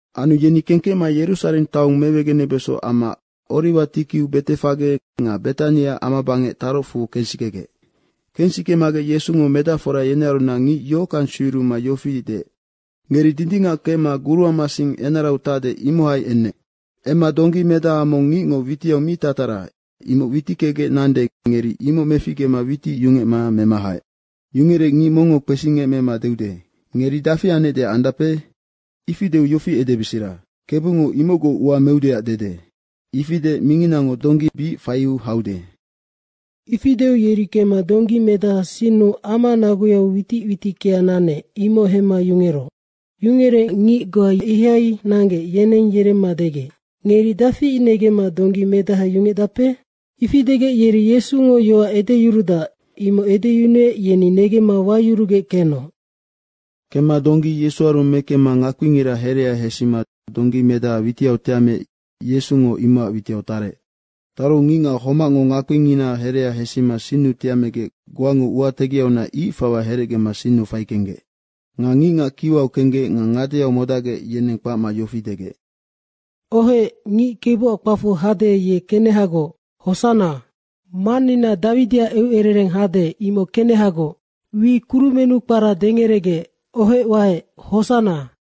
Anu yeni kengkecma Yerusareng taong mewegenebeso amma Oriwa tikiu Betefage nga Betani amabangec tarocfu kensikegec. Kensikemagec Yesungo medacfora yenearunac ngic yohockang sueyuruma yofi deec, “Ngeri dindingac kemma guruama sing enarau tacde, imohai emma donggi medaha mong ngicngo witiau mi tatara, imoc witickegec nande, ngeri imoc meficgema witic yungecma mema haec. Yungerec ngic mongngo kpesingemecma deude, ‘Ngeri dafi anecdeac andape?’ ifi deu yofi edebesera, ‘Kebungo imocgoc ua meudeac dede.’ ifi deec minginango donggi bic faiu haude.” Ifi deu yeri kemma donggi medaha sinnu ama naguyau witic witickea nanec, imoc hemma yungeroc. Yungerec ngic goa ihai nanggec, yeneng yeremma degec, “Ngeri dafi negemma donggi medaha yungecdape?” Ifi degec yeri Yesungo yoac edeyuruec, imoc edeyunuec yeni negemma wayurugec kenoc. Kemma donggi Yesuaru mekemma ngakpingira herea hesima donggi medaha witiau tiameec Yesungo imocac witiau tarec. Taru ngicngac homacngo ngakpingina herea hesima sinnu tiamegec goango ua tegiaunac ic fawa herecgema sinnu faikenggec. Nga ngicngac kiwau kenggec nga ngadeau modacgec, yeneng kpacma yofi degec, “Ohec, ngic Kebuac kpacfu hade, ye kenehagoc, hosanna. Mannina Dawidiac eucerereng hade, imoc kenehagoc. Wi kurumennu kpara dengeregec, ohec waec, hosanna.”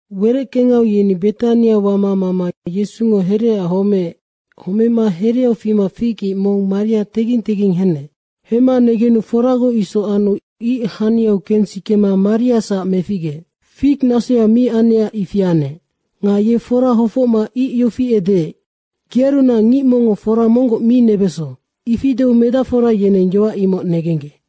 Wereckengau yeni Betania wama mama Yesungo hereaac homeec. Homema hereau fima fig ic mong maria tengging tengging henec. Hemma negenu foragoc isoc anu ic haniau kensikema maria meficgeec. Fig nasoya mi anecac ifi anec. Nga ye fora hofocma ic yofi edeec, “Gearunac ngic mongngo fora monggoc mi nebeso.” ifi deu medacfora yeneng yoac imoc negenggec.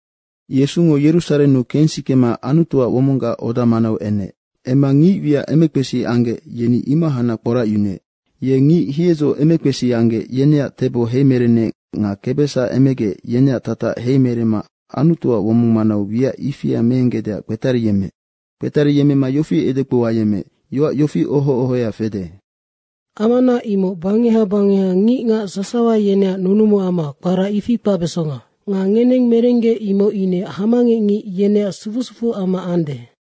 Yesungo Yerusarennu kensikema Anutuac womonggac oda manau enec. Emma ngic wiac emekpesi anggec, yeni imohacnac kporacyunuec. Ye ngic hiedzo emekpesi anggec, yeneac tebo heimerenec nga kebesac emegec, yeneac tatac heimeremma Anutuac womong manau wiac ifia meenggecdeac kpetariyemmeec. Kpetariyemmema yofi edekpou ayemmeec, “Yoac yofi oho ohoya fede, ‘Amana imoc bangeha bangeha ngicngac sasawa yeneac nunumuama, kpara ifi kpacbesonga.’ Nga ngeneng merenggec imoc ine hamangecngic yeneac sufu sufuama ande.”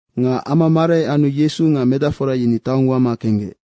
Nga ama marai anu Yesu nga medacfora yeni taong wama kenggec.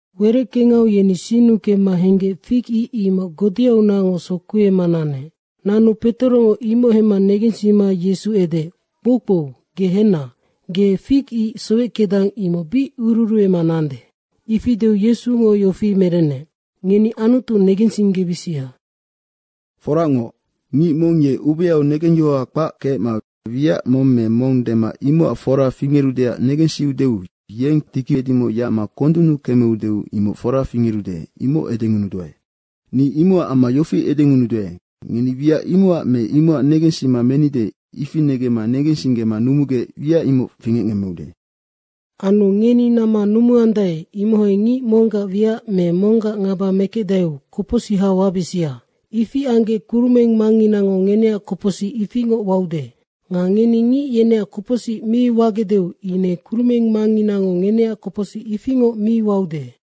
Wereckengau yeni sinnu kemma henggec fig ic imoc godeaunacngoc sokuema nanec. Nanu Petorongo imoc hemma negensima Yesu edeec, “Kpoukpou ge henna, ge fig ic soweckedang, imoc bic ururuema nande.” ifi deu Yesungo yofi merennec, “Ngeni Anutu negensinggebisia. Foracngoc, ngic mong ye ubeau negengyohoha kpac kecma wiac mong me mong dema imocac fora fingerudeac negensiudeu yeng tiki edimoc yacma kondunnu kemeu deu imoc foranoc fingerude, imoc edengunuduae. Ni imocac amma yofi edengunuduae, ngeni wiac imocac me imocac negensima menide, ifi negemma negensinggema numugec wiac imoc fingecngemmeude. Anu ngeni namma numuandae, imohai ngic monggac wiac me monggac ngaba mekecdaeu kopocsiha wabisia. Ifi anggec kurumeng Mangnginango ngeneac kopocsic ifingoc waude. Nga ngeni ngic yeneac kopocsic mi wagecdeu ine Kurumeng Mangnginango ngeneac kopocsic ifingoc mi waude.”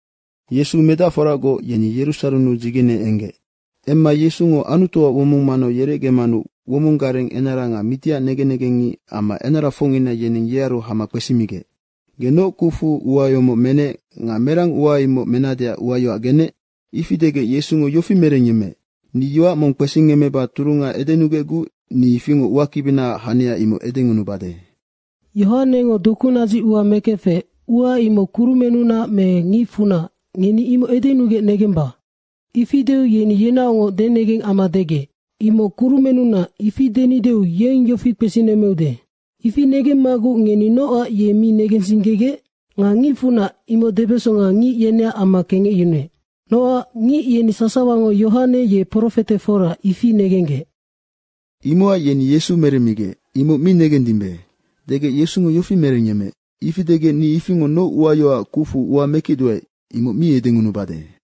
Yesu medacforagoc yeni Yerusarennu dzigene enggec. Emma Yesungo Anutuac womong manau yerecgemanu womong gareng enara nga mitiac negen negengngic amma enarafocngina, yeneng yearu hama kpesimigec, “Ge noc kucfu ua yomoc menec nga merang ua imoc menadeac uayoac genec?” Ifi degec Yesungo yofi merengyemmeec, “Ni yoac mong kpesingemmeba turunga edenugecguc ni ifingoc uakibinaac hania imoc edengunubade. Yohanengo dokunadzic ua mekefec, ua imoc kurumennunac me ngicfunac, ngeni imoc edenugec negemba.” Ifi deu yeni yenaocngoc denegeng amma degec, “‘Imoc kurumennunac.’ ifi denideu yeng yofi kpesinemmeude, ‘Ifi negemmaguc ngeni nocac ye mi negensinggegec?’” Nga ngicfunac, imoc debesonga ngic yeneac amma kengecyunuec. Nocac ngic yeni sasawango Yohane ye profete fora, ifi negenggec. Imocac yeni Yesu meremmigec, “Imoc mi negendimbe.” degec Yesungo yofi merengyemmeec, “Ifi degec, ni ifingoc noc uayoacac kucfu ua mekecduae, imoc mi edengunubade.”